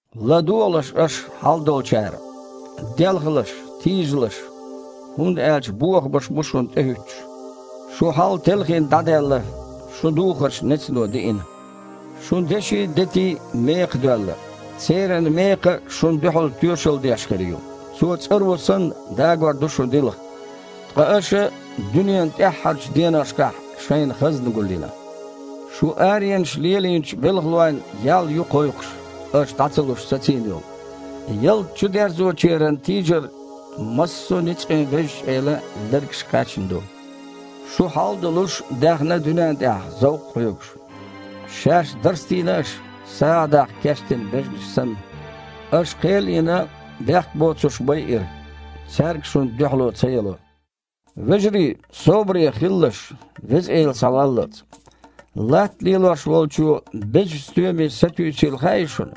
ЛадогІалаш аша, хьалдолчара: делхалаш, тийжалаш, хІунда аьлча бохамаш бу шуна тІехІуьттуш. Шун хьал, телхина, дІадаьлла, шун духарш нецано диина. Шун деши а, дети а мекхадоьлла. Церан мекха шуна дуьхьал тоьшалла деш хир ю, цо, цІаро санна, дагор ду шун дилха. Ткъа аша дуьненан тІаьххьарчу деношкахь шайна хазна гулйина. Шун аренаш лелийначу белхалойн ял ю кхойкхуш, аша, дІа ца луш, сацийна йолу. Ялта чудерзочеран тийжар массо а ницкъийн Везачу Элан лергашка кхаьчна ду. Шу, хьал а долуш, даьхна дуьнен тІехь, зовкх а хьоьгуш. Шаьш дарстийна аша, сагІа даккха кечдина бежанаш санна. Аша, кхел а йина, бехк боцурш байира. Цаьрга шуна дуьхьало ца яло. Вежарий, собаре хилалаш, Веза Эла схьаваллалц. Латта лелош волчо безачу стоьме сатуьйсийла хаьий шуна?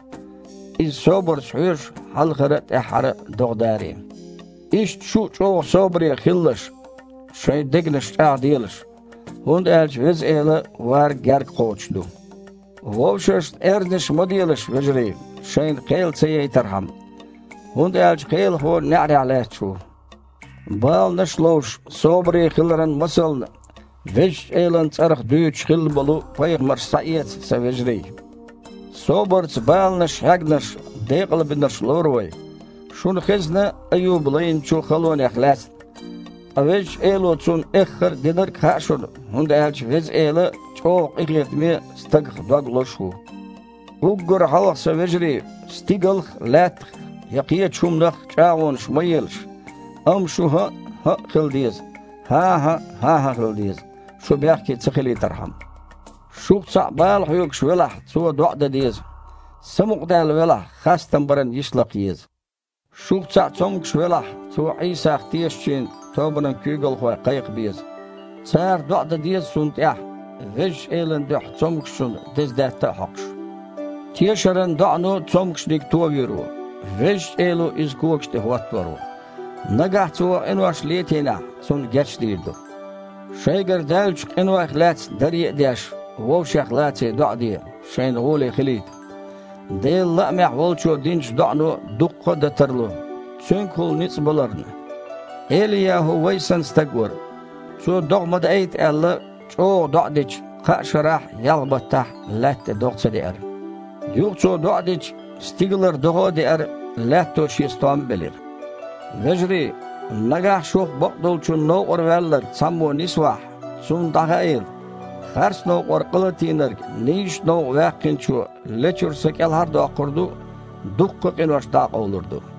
Иза собарца хьоьжу хьалхара а, тІаьхьара а догІа даре. Иштта шу а чІогІа собаре хилалаш, шайн дегнаш чІагІделаш, хІунда аьлча Веза Эла вар гергакхочуш ду. Вовшашна аьрзнаш ма делаш, вежарий, шайна кхел ца яйтархьама, хІунда аьлча Кхелахо неІарехь лаьтташ ву. Баланаш а ловш, собаре хиларан масална Везачу Элан цІарах дуьйцуш хилла болу пайхамарш схьаэца, сан вежарий. Собарца баланаш хьегнарш декъалбинарш лору вай. Шуна хезна Аюба лайначу халонех лаьцна. Ткъа Везачу Эло цунна эххар а динарг а хаьа шуна, хІунда аьлча Веза Эла чІогІа къинхетаме а, стагах дог лозуш а ву. Уггар хьалха, сан вежарий, стигалх а, лаьттах а, я кхечу хІуманах а чІагІонаш ма елаш, амма шун «хІаъ» «хІаъ» хила деза, «хІан-хІа» «хІан-хІа» хила деза, шу бехке ца хилийтархьама. Шух цхьаъ бала хьоьгуш велахь, цо доІа дан деза, самукъадаьлла велахь, хастам баран йиш лакха еза. Шух цхьаъ цомгуш велахь, цо Іийсах тешачийн тобанан куьйгалхой кхайкха беза. Цара доІа дан деза цунна тІехь, Везачу Элан дуьхьа цомгушчунна деза даьтта а хьокхуш. Тешаран доІано цомгушниг товийр ву, Везачу Эло иза когаш тІе хІоттор ву. Нагахь цо къинош летийнехь, цунна гечдийр ду. Шайгара даьллачу къинойх лаьцна даре а деш, вовшех лаций доІа де, шайна гІоле хилийта: Делан лаамехь волчо динчу доІано дуккха а дан тарло, цуьнгахула ницкъ баларна. ЭлияхІу вай санна стаг вара. Цо, догІа ма даийта аьлла, чІогІа доІа дича, кхаа шарахь а, ялх баттахь а лаьтта тІе догІа ца деара. Юха цо доІа дича, стигалара догІа а деара, лаьтто шен стом а белира. Вежарий, нагахь шух бакъдолчун новкъара ваьлларг цхьаммо нисвахь, цунна дІахаийла, харц новкъара къа латийнарг нийсачу новкъа ваьккхинчо лечуьра са кІелхьар а доккхур ду, дуккха а къинош дІа а къовлур ду.